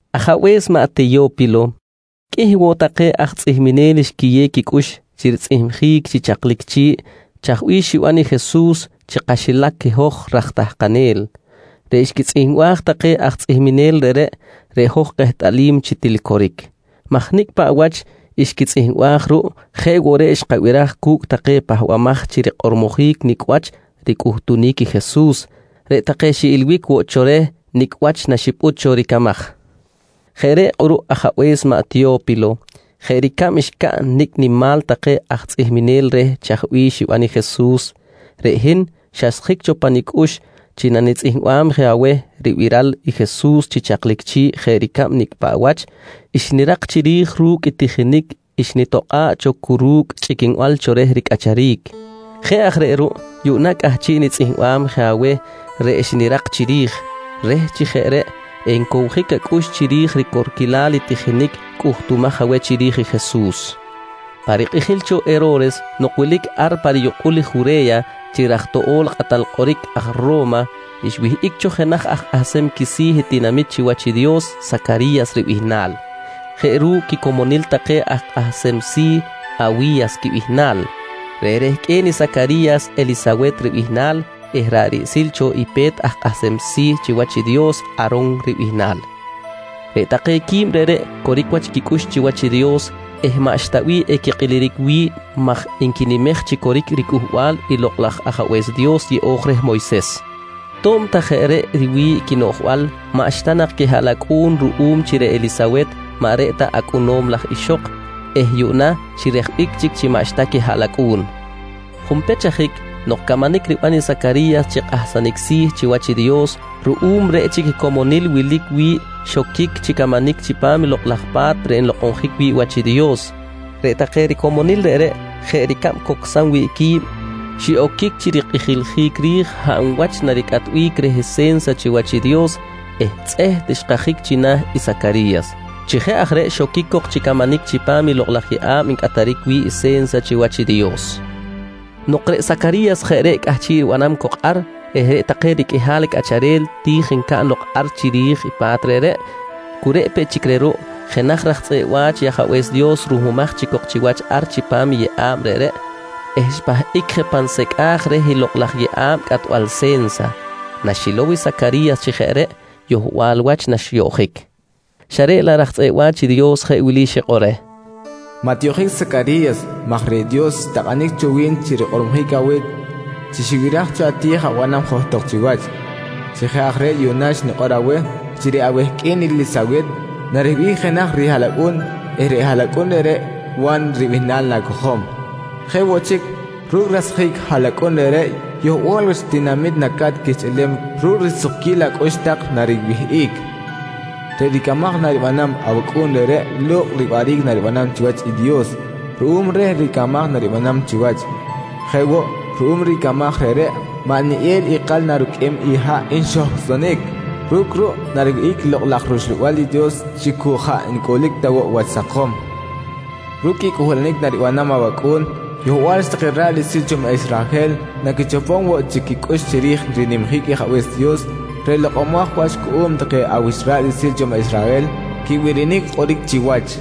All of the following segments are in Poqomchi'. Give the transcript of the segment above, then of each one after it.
Ajabe̱s maꞌ Teyo̱pilo, qꞌuih woꞌ take aj tzꞌihminel xquiyew quicꞌux chi ritzꞌihmjic chi chaklic chi̱ꞌ chaj bih xiban i Jesus chi kaxilac i hoj raj tahkanel. Reꞌ xquitzꞌihmbaj take aj tzꞌihmenel reꞌreꞌ, reꞌ hoj kehtꞌalim chi til coric maj nicꞌ paꞌ wach xquitzꞌihmbaj ruꞌ jeꞌ woꞌ reꞌ xkabiraj cu̱cꞌ take pahbamaj chi rikꞌormojic nicꞌ wach ricꞌuhtunic i Jesus, reꞌ take xiꞌilbic woꞌ cho reh nicꞌ wach naxipꞌut cho ricamaj. Jeꞌ reꞌ kꞌuruꞌ ajabe̱s maꞌ Teyo̱pilo, jeꞌ ricab xcaꞌn nicꞌ nimal take aj tzꞌihminel reh chaj bih xiban i Jesus, reꞌ hin xasjic cho pa nicꞌux chi nanitzꞌihmbam je aweh ribiral i Jesus chi chaklic chi̱ꞌ jeꞌ ricab nicꞌ paꞌ wach xnirak chiri̱j ru̱cꞌ i tijinic xnitokꞌa̱ꞌ cho cu ru̱cꞌ chꞌiquinbal cho reh ricꞌacharic. Jeꞌ aj reꞌ ruꞌ yuꞌna cꞌahchiꞌ nitzꞌihmbam je aweh reꞌ xnirak chiri̱j, reh chi jeꞌ reꞌ encowjic acꞌux chiri̱j ricorquilal i tijinic cꞌuhtumaj aweh chiri̱j i Jesus. Pa rikꞌijil cho Hero̱res nok wilic ar pa riyukꞌul i Jure̱ya chi raj toꞌo̱l i kꞌatal kꞌoric aj Ro̱ma, xwihꞌic cho jenaj aj kꞌahsem quisi̱ i tinamit chiwach i Dios Sacari̱yas ribihnal, jeꞌ ru̱cꞌ quicomonil take aj kꞌahsem si̱ Awi̱yas quibihnal. Reꞌ rehqꞌue̱n i Sacari̱yas Elisawet ribihnal eh ra̱ꞌ riꞌsil cho i pe̱t aj kꞌahsem si̱ chiwach i Dios A̱ron ribihnal. Reꞌ take quib reꞌreꞌ coric wach quicꞌux chiwach i Dios eh maꞌxta bih equikꞌiliric wi̱ꞌ maj nquinimej chi coric riCꞌuhbal i Lokꞌ laj Ajabe̱s Dios yeꞌo̱j reh Moyses. To̱b ta jeꞌ reꞌ riwi̱ꞌ quinoꞌjbal, maꞌxta nak quihaꞌlacꞌu̱n ruꞌum chi reꞌ Elisawet maꞌ reꞌ ta acꞌunom laj ixok eh yuꞌna xirejbic chic chi maꞌxta quihaꞌlacꞌu̱n. Junpech ajic nok camanic riban i Sacari̱yas chi kꞌahsanic si̱ chiwach i Dios ruꞌum reꞌ chic i comonil wilic wi̱ꞌ xoquic chi camanic chipam Lokꞌ laj Pa̱t reꞌ nlokꞌonjic wi̱ꞌ wach i Dios, reꞌ take ricomonil reꞌreꞌ jeꞌ ricab cocsam wi̱ꞌ qui̱b, xiꞌoquic chi rikꞌijiljic ri̱j hab wach naricꞌatbic reh se̱nsa chiwach i Dios eh tzꞌeht xkajic china̱ i Sacari̱yas. Chi jeꞌ aj reꞌ xoquic cok chi camanic chipam lokꞌ laj yeꞌa̱b ncꞌataric wi̱ꞌ i se̱nsa chiwach i Dios. Nok reꞌ Sacari̱yas jeꞌ reꞌ cꞌahchiꞌ ribanam cok ar eh reꞌ take riqꞌuihal cꞌacharel ti̱j ncaꞌn lok ar chiri̱j i pa̱t reꞌreꞌ, cu reꞌ peꞌ chic reh ruꞌ jenaj raj tzꞌeꞌ wa̱ch i Ajabe̱s Dios ruhmumaj chic cok chiwach ar chipam i yeꞌa̱b reꞌreꞌ eh xpahꞌic je pan secꞌaj reh i lokꞌ laj yeꞌa̱b cꞌatbal se̱nsa. Naxilow i Sacari̱yas chi jeꞌ reꞌ, yohbal wach naxyoꞌjic xa reꞌ laꞌ raj tzꞌeꞌ wa̱ch i Dios jeꞌ wili xikꞌor reh: «Maꞌ tiyoꞌjic Sacari̱yas maj reꞌ Dios xtakꞌanic cho wi̱n chi rikꞌormojic aweh chi xibiraj cho ati̱j abanam johtok chiwach. Chi jeꞌ aj reꞌ yuꞌna nikꞌor aweh chi reꞌ awehqꞌue̱n Elisawet nariwihꞌic jenaj rihaꞌlacꞌu̱n eh reꞌ haꞌlacꞌun reꞌreꞌ Wa̱n ribihnal na̱cojom. Jeꞌ woꞌ chic, ru̱cꞌ rasjic ahaꞌlacꞌu̱n reꞌreꞌ yohbal wach tinamit naca̱t quihchꞌilem ru̱cꞌ risukquil acꞌux tak nariwihꞌic. Reꞌ ricamaj naribanam, awacꞌu̱n reꞌreꞌ lo̱kꞌ riwaꞌric naribanam chiwach i Dios ruꞌum reh ricamaj naribanam chiwach. Jeꞌ woꞌ, ruꞌum ricamaj reꞌreꞌ maꞌ neꞌel ikal naruqꞌuem i haꞌ nxohcꞌsonic. Ru̱cꞌ ruꞌ nariwihꞌic i Lokꞌ laj rUxlabal i Dios chi cu jaꞌ ncꞌulic ta woꞌ wach sakom. «Ru̱cꞌ i cꞌuhbalanic naribanam awacꞌu̱n, yohbal wach take ra̱ꞌ riꞌsil cho maꞌ Israhel naquichopom woꞌ chic quicꞌux chiri̱j rinimjic Ajabe̱s Dios reꞌ lokꞌomaj wach cuꞌum take awich ra̱ꞌ riꞌsil cho maꞌ Israhel quibirinic kꞌoric chiwach.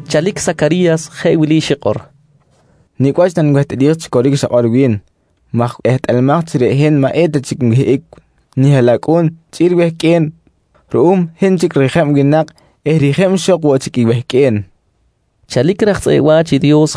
Chalic i Sacari̱yas jeꞌ wili xikꞌor: «Nicꞌ wach nanwehtꞌalij chi coric i xakꞌor wi̱n? maj ehtꞌalamaj chi reꞌ hin maꞌ eta chic nwihꞌic nihaꞌlacꞌu̱n chꞌi̱l wehqꞌue̱n ruꞌum hin chic rijeb winak eh rijeb ixok woꞌ chic i wehqꞌue̱n, nqui reh raj tzꞌeꞌ wa̱ch i Dios.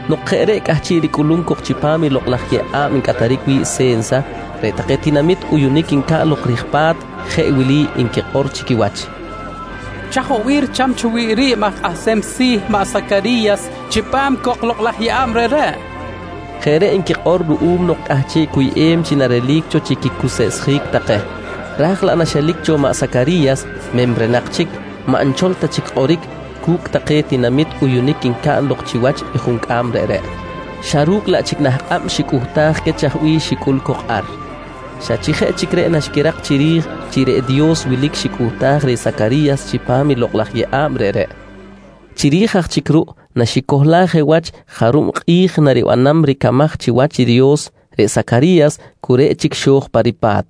Nok jeꞌ reꞌ cꞌahchiꞌ ricꞌuluric cok chipam i lokꞌ laj yeꞌa̱b ncꞌataric wi̱ꞌ se̱nsa, reꞌ take tinamit uyunic ncaꞌn lok rij pa̱t jeꞌ wili nquikꞌor chi quiwach: «Chaj woꞌ bih richam cho wi̱ꞌ ri̱b aj kꞌahsem si̱ maꞌ Sacari̱yas chipam cok lokꞌ laj yeꞌa̱b reꞌreꞌ? nqui nquikꞌor. Jeꞌ reꞌ nquikꞌor ruꞌum nok cꞌahchiꞌ cuyꞌem chi narelic cho chi quicuseꞌsjic take. Raj laꞌ naxelic cho maꞌ Sacari̱yas memrenak chic, maꞌ xchol ta chic kꞌoric cu̱cꞌ take tinamit uyunic ncaꞌn lok chiwach i juncꞌam reꞌreꞌ, xa ru̱cꞌ laꞌ chic nah kꞌab xicꞌuhtaj queh chaj bih xicꞌul cok ar. Xa chi jeꞌ chic reꞌ naxquirak chiri̱j chi reꞌ Dios wilic xicꞌuhtaj reh Sacari̱yas chipam lokꞌ laj yeꞌa̱b reꞌreꞌ. Chiri̱j aj chic ruꞌ naxicohlaj je wach jarub kꞌi̱j naribanam ricamaj chiwach i Dios, reꞌ Sacari̱yas cu reꞌ chic xo̱j pa ripa̱t.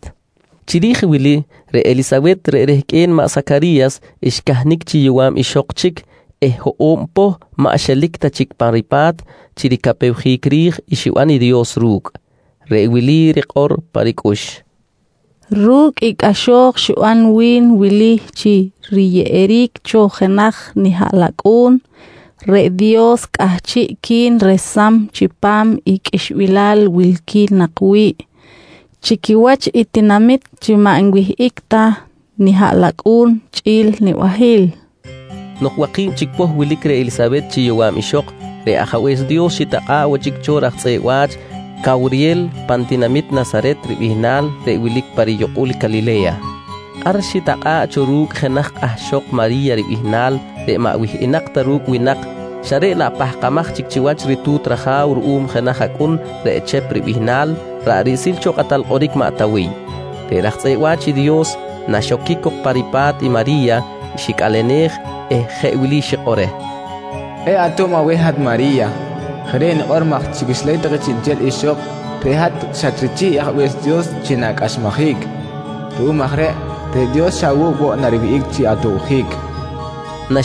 Chiri̱j wili, reꞌ Elisawet reꞌ rehqꞌue̱n maꞌ Sacari̱yas xcahnic chi yowa̱b ixok chic eh hoꞌo̱b poh maꞌ xelic ta chic pa ripa̱t chi ricapewjic ri̱j i xiban i Dios ru̱cꞌ. Reꞌ wili rikꞌor pa ricꞌux: «Ru̱cꞌ i cꞌaxo̱j xiban wi̱n wili chi riyeꞌeric cho jenaj nihaꞌlacꞌu̱n, reꞌ Dios cꞌahchiꞌqui̱n resam chipam i qꞌuixbilal wilqui̱n nak wi̱ꞌ chi quiwach i tinamit chi maꞌ nwihꞌic ta nihaꞌlacꞌu̱n chꞌi̱l nibahil, nqui pa ricꞌux. Nok waki̱b chic poh wilic reh Elisawet chi yowa̱b ixok, reꞌ Ajabe̱s Dios xitakꞌa̱ꞌ woꞌ chic cho raj tzꞌeꞌ wa̱ch Cawriyel pan tinamit Nasaret ribihnal reꞌ wilic pa riyukꞌul Calile̱ya. Ar xitakꞌa̱ꞌ cho ru̱cꞌ jenaj kꞌahxok Mari̱ya ribihnal reꞌ maꞌ wihꞌinak ta ru̱cꞌ winak xa reꞌ laꞌ pahkamaj chic chiwach ritu̱t raja̱w ruꞌum jenaj acꞌun reꞌ Chep ribihnal ra̱ꞌ riꞌsil cho kꞌatal kꞌoric maꞌ Tawiy. Reꞌ raj tzꞌeꞌ wa̱ch i Dios, naxoquic cok pa ripa̱t i Mari̱ya, xicꞌalenej eh jeꞌ wili xikꞌor reh: «Kꞌe̱ꞌ ato̱b aweh hat Mari̱ya! Jeꞌ reꞌ nikꞌor maj chi quixilac take chiꞌnchel ixok reꞌ hat xatrichih i Ajabe̱s Dios chi na̱cꞌaxmajic. Ruꞌum aj reꞌ, reꞌ Dios xa awu̱cꞌ woꞌ nariwihꞌic chi atobjic, nqui raj tzꞌeꞌ wa̱ch i Dios reh.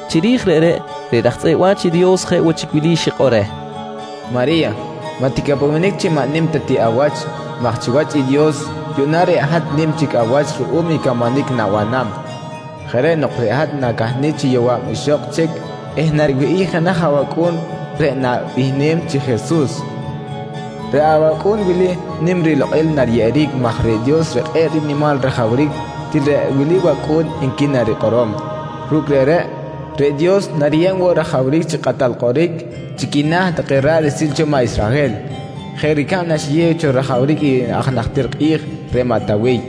Chiri̱j reꞌreꞌ, reꞌ raj tzꞌeꞌ wa̱ch i Dios jeꞌ woꞌ chic wili xikꞌor reh: «Mari̱ya, maꞌ ticapewenic chi maꞌ nim ta ti awach maj chiwach i Dios yuꞌna reꞌ hat nim chic awach ruꞌum i camanic na̱banam. Jeꞌ reꞌ nok reꞌ hat na̱cahnic chi yowa̱b ixok chic eh nariwihꞌic jenaj awacꞌu̱n reꞌ na̱bihnem chi Jesus. Reꞌ awacꞌu̱n wili nim rilokꞌil nariyeꞌeric maj reꞌ Dios reꞌ kꞌe̱ꞌ rinimal rajawric til reꞌ wili wacꞌu̱n nqui narikꞌorom. Ru̱cꞌ reꞌreꞌ, reꞌ Dios nariyeb woꞌ rajawric chi kꞌatal kꞌoric chi quina̱ take ra̱ꞌ riꞌsil cho maꞌ Israhel, jeꞌ ricab naxiyew cho rajawric i aj najtir kꞌi̱j, reꞌ maꞌ Tawiy.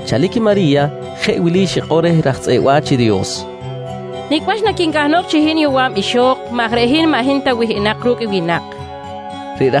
Chalic i Mari̱ya jeꞌ wili xikꞌor reh i raj tzꞌeꞌ wa̱ch i Dios: «Nicꞌ wach naquincahnok chi hin yowa̱b ixok maj reꞌ hin maꞌ hin ta wihꞌinak ru̱cꞌ winak? nqui reh.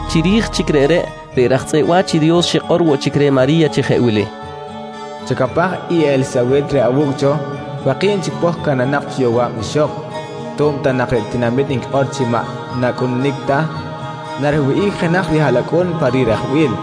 Chiri̱j chic reꞌ, reꞌ raj tzꞌeꞌ wa̱ch i Dios xikꞌor woꞌ chic reh Mari̱ya chi jeꞌ wili: «Chacapaj i Elisawet reꞌ awu̱cꞌ cho, waki̱b chic poh cahnanak cho chi yowa̱b ixok. To̱b ta nak reꞌ tinamit nquikꞌor chi maꞌ n-nacꞌununic ta, nariwihꞌic jenaj rihaꞌlacꞌu̱n pa rirejbil.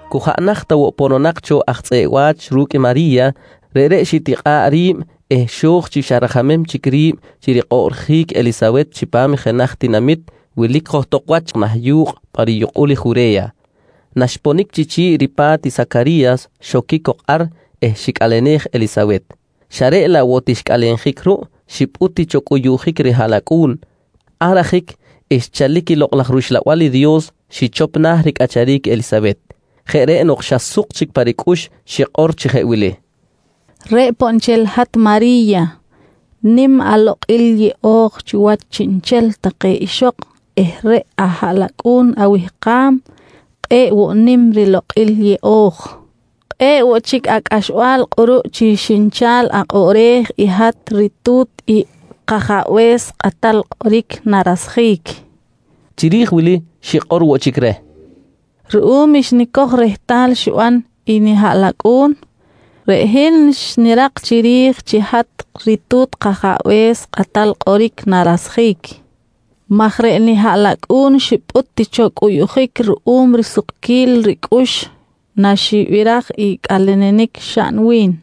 Cu jaꞌ naht ta woꞌ pononak cho aj tzꞌeꞌ wa̱ch ru̱cꞌ i Mari̱ya, reꞌreꞌ xitikꞌa̱ꞌ ri̱b eh xo̱j chi xa rajamem chic ri̱b chi rikꞌoꞌrjic i Elisawet chipam jenaj tinamit wilic johtok wach yu̱kꞌ pa riyukꞌul Jure̱ya. Naxponic chi chi̱ꞌ ripa̱t i Sacari̱yas xoquic cok ar eh xicꞌalenej Elisawet. Xa reꞌ laꞌ woꞌ ti xicꞌalenjic ruꞌ, xipꞌut ti cho cꞌuyuꞌjic rihaꞌlacꞌu̱n. Ar ajic xchalic i Lokꞌ laj rUxlabal i Dios xichop na̱ ricꞌacharic i Elisawet. Jeꞌ reꞌ nok xa suk chic pa ricꞌux xikꞌor chi jeꞌ wili: «Reꞌ poꞌ nchel hat Mari̱ya. Nim alokꞌil yeꞌo̱j chi quiwach chiꞌnchel take ixok eh reꞌ ahaꞌlacꞌu̱n awihkam kꞌe̱ꞌ woꞌ nim rilokꞌil yeꞌo̱j! Kꞌe̱ꞌ woꞌ chic acꞌaxbal kꞌuruꞌ chi xinchal akꞌoꞌrej i hat ritu̱t i kAjabe̱s Kꞌatal Kꞌoric narasjic, nqui reh. Chiri̱j wili, xikꞌor woꞌ chic reh: «Ruꞌum xnicoj rehtal xiban i nihaꞌlacꞌu̱n, reꞌ hin xnirak chiri̱j chi hat ritu̱t kAjabe̱s Kꞌatal Kꞌoric narasjic maj reꞌ nihaꞌlacꞌu̱n xipꞌut ti cho cꞌuyuꞌjic ruꞌum risukquil ricꞌux naxibiraj i cꞌalenenic xaꞌn wi̱n.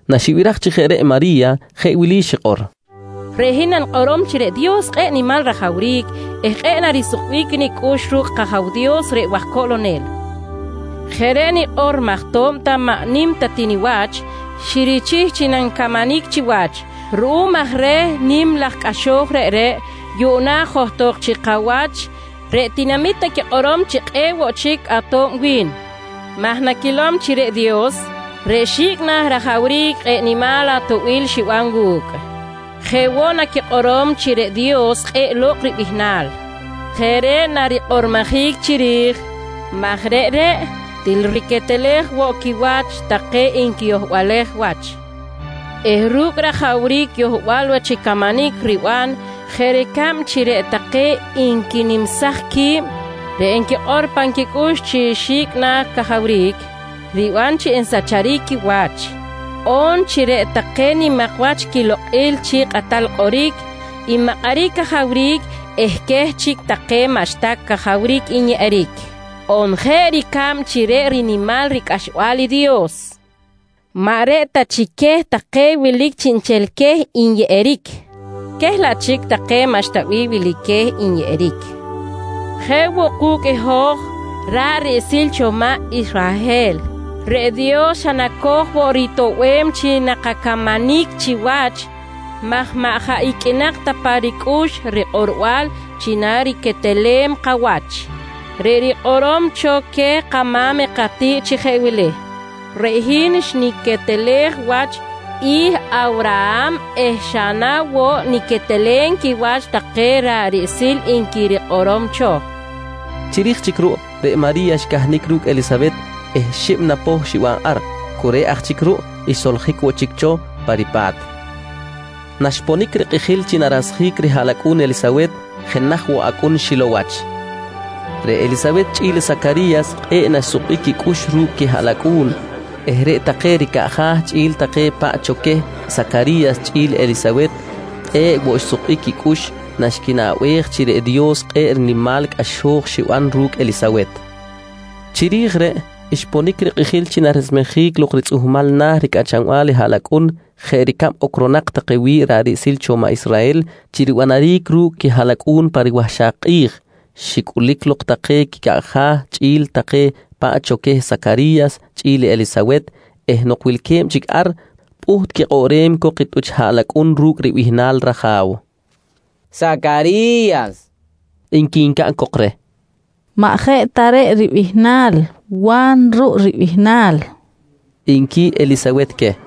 Naxibiraj chi jeꞌ reꞌ i Mari̱ya jeꞌ wili xikꞌor: «Reꞌ hin nanikꞌorom chi reꞌ Dios kꞌe̱ꞌ nimal rajawric eh kꞌe̱ꞌ woꞌ narisukbic nicꞌux ru̱cꞌ kAja̱w Dios reꞌ waj coꞌlonel. Jeꞌ reꞌ nikꞌor maj to̱b ta maꞌ nim ta ti niwach, xirichih chi nanicamanic chiwach. Ruꞌum aj reh i nim laj cꞌaxo̱j reꞌreꞌ, yuꞌna johtok chi kawach reꞌ tinamit naquikꞌorom chi kꞌe̱ꞌ woꞌ chic ato̱b wi̱n, maj naquilom chi reꞌ Dios reꞌ xi̱cꞌ na̱ rajawric kꞌe̱ꞌ nimal atoꞌbil xiban wu̱cꞌ. Jeꞌ woꞌ, naquikꞌorom chi reꞌ Dios kꞌe̱ꞌ lo̱kꞌ ribihnal. Jeꞌ reꞌ narikꞌormojic chiri̱j maj reꞌreꞌ til riquetelej woꞌ quiwach take nquiyohbalej wach eh ru̱cꞌ rajawric yohbal wach camanic riban, jeꞌ ricab chi reꞌ take nquinimsaj qui̱b reꞌ nquikꞌor pan quicꞌux chi xi̱cꞌ na̱ cajawric, riban chi nsacharic quiwach, on chi reꞌ take nimak wach quilokꞌil chi kꞌatal kꞌoric nmakꞌaric cajawric eh queh chic take maꞌxta cajawric nyeꞌeric, on jeꞌ ricab chi reꞌ rinimal ricꞌaxbal i Dios maꞌ reꞌ ta chic queh take wilic chiꞌnchel queh nyeꞌeric, queh laꞌ chic take maꞌxta bih wilic queh nyeꞌeric. Jeꞌ woꞌ ku̱cꞌ i hoj ra̱ꞌ riꞌsil cho maꞌ Israhel, reꞌ Dios xa naco̱j woꞌ ritoꞌbem chi nakacamanic chiwach maj maꞌ jaꞌ iqꞌuinak ta pa ricꞌux rikꞌorbal chi nariquetelem kawach, reꞌ rikꞌorom cho queh kama̱m katiꞌt chi jeꞌ wili: “Reꞌ hin xniquetelej wach i Awraham eh xa na woꞌ niquetelem quiwach take ra̱ꞌ riꞌsil, nqui rikꞌorom cho, nqui Mari̱ya. Chiri̱j chic ruꞌ, reꞌ Mari̱ya xcahnic ru̱cꞌ Elisawet eh xib na poh xiban ar. Cu reꞌ aj chic ruꞌ, xsoljic woꞌ chic cho pa ripa̱t. Naxponic rikꞌijil chi narasjic rihaꞌlacꞌu̱n i Elisawet, jenaj woꞌ acꞌun xilow wach. Reꞌ Elisawet chꞌi̱l i Sacari̱yas kꞌe̱ꞌ naxsukbic quicꞌux ru̱cꞌ quihaꞌlacꞌu̱n eh reꞌ take ricaꞌja̱ chꞌi̱l take paꞌ cho queh Sacari̱yas chꞌi̱l Elisawet kꞌe̱ꞌ woꞌ xsukbic quicꞌux naxquinaꞌbej chi reꞌ Dios kꞌe̱ꞌ rinimal cꞌaxo̱j xiban ru̱cꞌ Elisawet. Chiri̱j reꞌ, xponic rikꞌijil chi naresmejic lok ritzꞌuhmal na̱ ricꞌachanbal i haꞌlacꞌun jeꞌ ricab ocronak take wi̱ꞌ ra̱ꞌ riꞌsil cho maꞌ Israhel chi ribanaric ru̱cꞌ quihaꞌlacꞌu̱n pa riwahxak kꞌi̱j, xicꞌulic lok take quicaꞌja̱ chꞌi̱l take paꞌ cho queh Sacari̱yas chꞌi̱l Elisawet eh nok wilque̱b chic ar, pꞌuht quikꞌoꞌrem cok i tꞌuch haꞌlacꞌun ru̱cꞌ ribihnal raja̱w. —Sacari̱yas, nqui ncaꞌn cok reh. —Maꞌ jeꞌ ta reꞌ ribihnal. Wa̱n ruꞌ ribihnal, nqui Elisawet queh.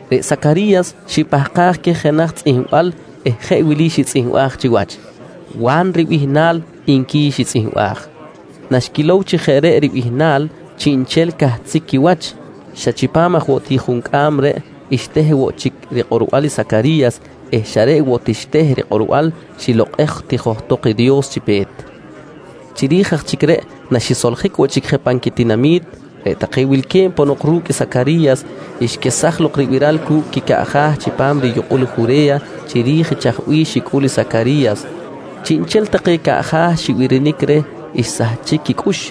Reꞌ Sacari̱yas xipahkaj queh jenaj tzꞌihmbal eh jeꞌ wili xitzꞌihmbaj chiwach: «Wa̱n ribihnal, nqui xitzꞌihmbaj. Naxquilow chi jeꞌ reꞌ ribihnal, chiꞌnchel cahtzic quiwach. Xa chipam aj woꞌ ti juncꞌam reꞌ, xteh woꞌ chic rikꞌorbal i Sacari̱yas eh xa reꞌ woꞌ ti xteh rikꞌorbal, xilokꞌej ti johtok i Dios chi pe̱t. Chiri̱j aj chic reꞌ naxisoljic woꞌ chic je pan quitinami̱t, reꞌ take wilque̱b ponok ru̱cꞌ i Sacari̱yas, xquesaj lok ribiral cu̱cꞌ quicaꞌja̱ chipam riyukꞌul i Jure̱ya chiri̱j i chaj bih xicꞌul i Sacari̱yas. Chiꞌnchel take caꞌja̱ xibirinic reh xsahchic quicꞌux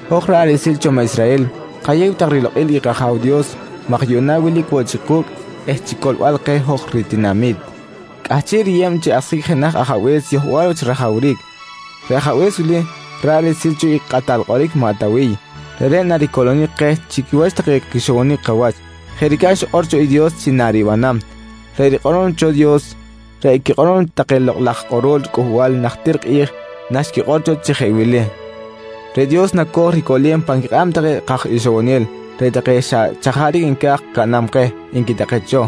«Hoj ra̱ꞌ riꞌsil cho maꞌ Israhel kayew tak rilokꞌil i kAja̱w Dios maj yuꞌna wilic woꞌ chic ku̱cꞌ eh chi coꞌlbal keh hoj ritinami̱t, cꞌahchiꞌ riyeb chi asjic jenaj Ajabe̱s yohbal wach rajawric. Reꞌ Ajabe̱s wili ra̱ꞌ riꞌsil cho i kꞌatal kꞌoric maꞌ Tawiy, reꞌreꞌ naricoꞌlonic keh chi quiwach take quixowonic kawach, jeꞌ ricab xikꞌor cho i Dios chi naribanam. Reꞌ rikꞌorom cho Dios, reꞌ i quikꞌorom cho take lokꞌ laj raj kꞌorol cꞌuhbal najtir kꞌi̱j naxquikꞌor cho chi jeꞌ wili: “Reꞌ Dios naco̱j ricoꞌlem pan quikꞌab take kaj ixowonel reꞌ take xa chajaric nca̱j caꞌnam keh, nqui take cho.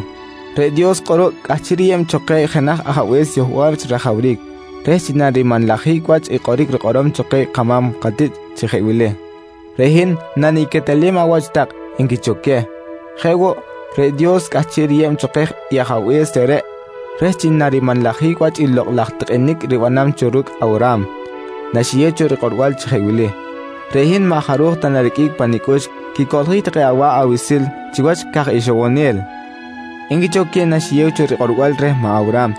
«Reꞌ Dios kꞌuruꞌ cꞌahchiꞌ riyeb cho keh jenaj ajabe̱s yohbal wach rajawric reh chi narimanlajic wach i kꞌoric rikꞌorom cho queh kama̱m katiꞌt chi jeꞌ wili: “Reꞌ hin naniquetelem awach tak, nqui cho queh. «Jeꞌ woꞌ, reꞌ Dios cꞌahchiꞌ riyeb cho keh i Ajabe̱s reꞌreꞌ reh chi narimanlajic wach i lokꞌ laj tikꞌinic ribanam cho ru̱cꞌ Awraham, naxiyew cho rikꞌorbal chi jeꞌ wili: “Reꞌ hin maꞌ jaruj ta nariqꞌuic pa nicꞌux quicoꞌljic take awa̱ꞌ awiꞌsil chiwach caj ixowonel, nqui cho queh naxiyew cho rikꞌorbal reh maꞌ Awraham.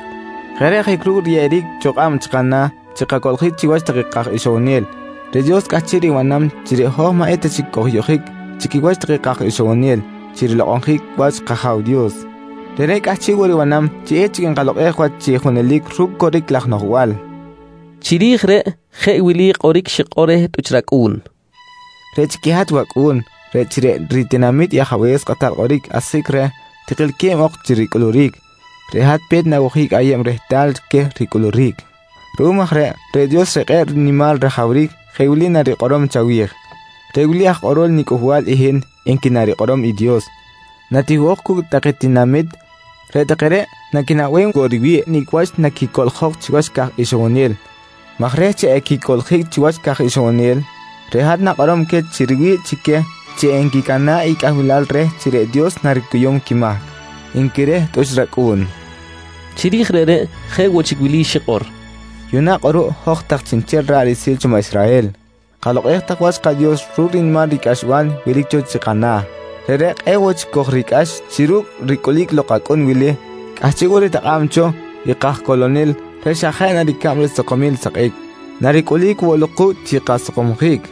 «Jeꞌ reꞌ ajic ru̱cꞌ riyeꞌeric cho kꞌab chi kana̱ chi kacoꞌljic chiwach take kaj ixowonel, reꞌ Dios cꞌahchiꞌ ribanam chi reꞌ hoj maꞌ eta chic kojyoꞌjic chi quiwach take kaj ixowonel chi rilokꞌonjic wach kAja̱w Dios. Reꞌreꞌ cꞌahchiꞌ woꞌ ribanam chi echic nkalokꞌej wach chi junelic ru̱cꞌ coric laj noꞌjbal, nqui Sacari̱yas. Chiri̱j reꞌ jeꞌ wili i kꞌoric xikꞌor reh tꞌuch racꞌu̱n: «Reꞌ chic i hat wacꞌu̱n, reh chi reꞌ ritinami̱t i Ajabe̱s Kꞌatal Kꞌoric asjic reh tikilque̱b ok chi ricꞌulic, reꞌ hat pe̱t na̱wojic ayeb rehtal queh ricꞌulic. Ruꞌum aj reꞌ, reꞌ Dios reꞌ kꞌe̱ꞌ nimal rajawric jeꞌ wili narikꞌorom chawi̱j: ‹Reꞌ wili aj kꞌorol niCꞌuhbal i hin, nqui narikꞌorom i Dios. «Natiwihꞌok cu̱cꞌ take tinamit, reꞌ take reꞌ naquinaꞌbem woꞌ riwi̱ꞌ nicꞌ wach naquicoꞌljok chiwach caj ixowonel, maj reh chi equicoꞌljic chi wach caj ixowonel, reꞌ hat na̱kꞌorom queh chi riwi̱ꞌ chi queh chi enquicana̱ꞌ i cꞌahbilal reh chi reꞌ Dios naricuyum quimahc, nqui reh tꞌuch racꞌu̱n. Chiri̱j reꞌreꞌ, jeꞌ woꞌ chic wili xikꞌor: «Yuꞌna kꞌuruꞌ hoj tak chiꞌnchel ra̱ꞌ riꞌsil cho maꞌ Israhel, kalokꞌej tak wach kaDios ru̱cꞌ rinimal ricꞌaxbal wilic cho chi kana̱. Reꞌreꞌ kꞌe̱ꞌ woꞌ chic kojricꞌax chi ru̱cꞌ ricꞌulic lok acꞌun wili, cꞌahchiꞌ woꞌ ritakꞌa̱b cho i kajcoꞌlonel reꞌ xa jeꞌ na ricab risakomil i sakꞌic, naricꞌulic woꞌ lok ku̱cꞌ chi kasakomjic.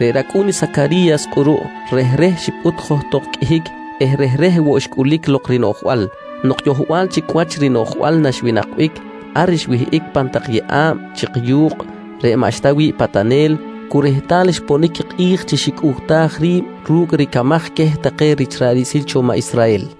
Reꞌ racꞌu̱n i Sacari̱yas kꞌuruꞌ, rehreh xipꞌut johtok qꞌuihic eh rehreh woꞌ xcꞌulic lok rinoꞌjbal. Nok yohbal chic wach rinoꞌjbal naxwinakbic, ar xwihꞌic pan tak yeꞌa̱b chik yu̱kꞌ reꞌ maꞌxta wi̱ꞌ patanel cu rehtal xponic kꞌi̱j chi xicꞌuhtaj ri̱b ru̱cꞌ ricamaj queh take rich ra̱ꞌ riꞌsil cho maꞌ Israhel.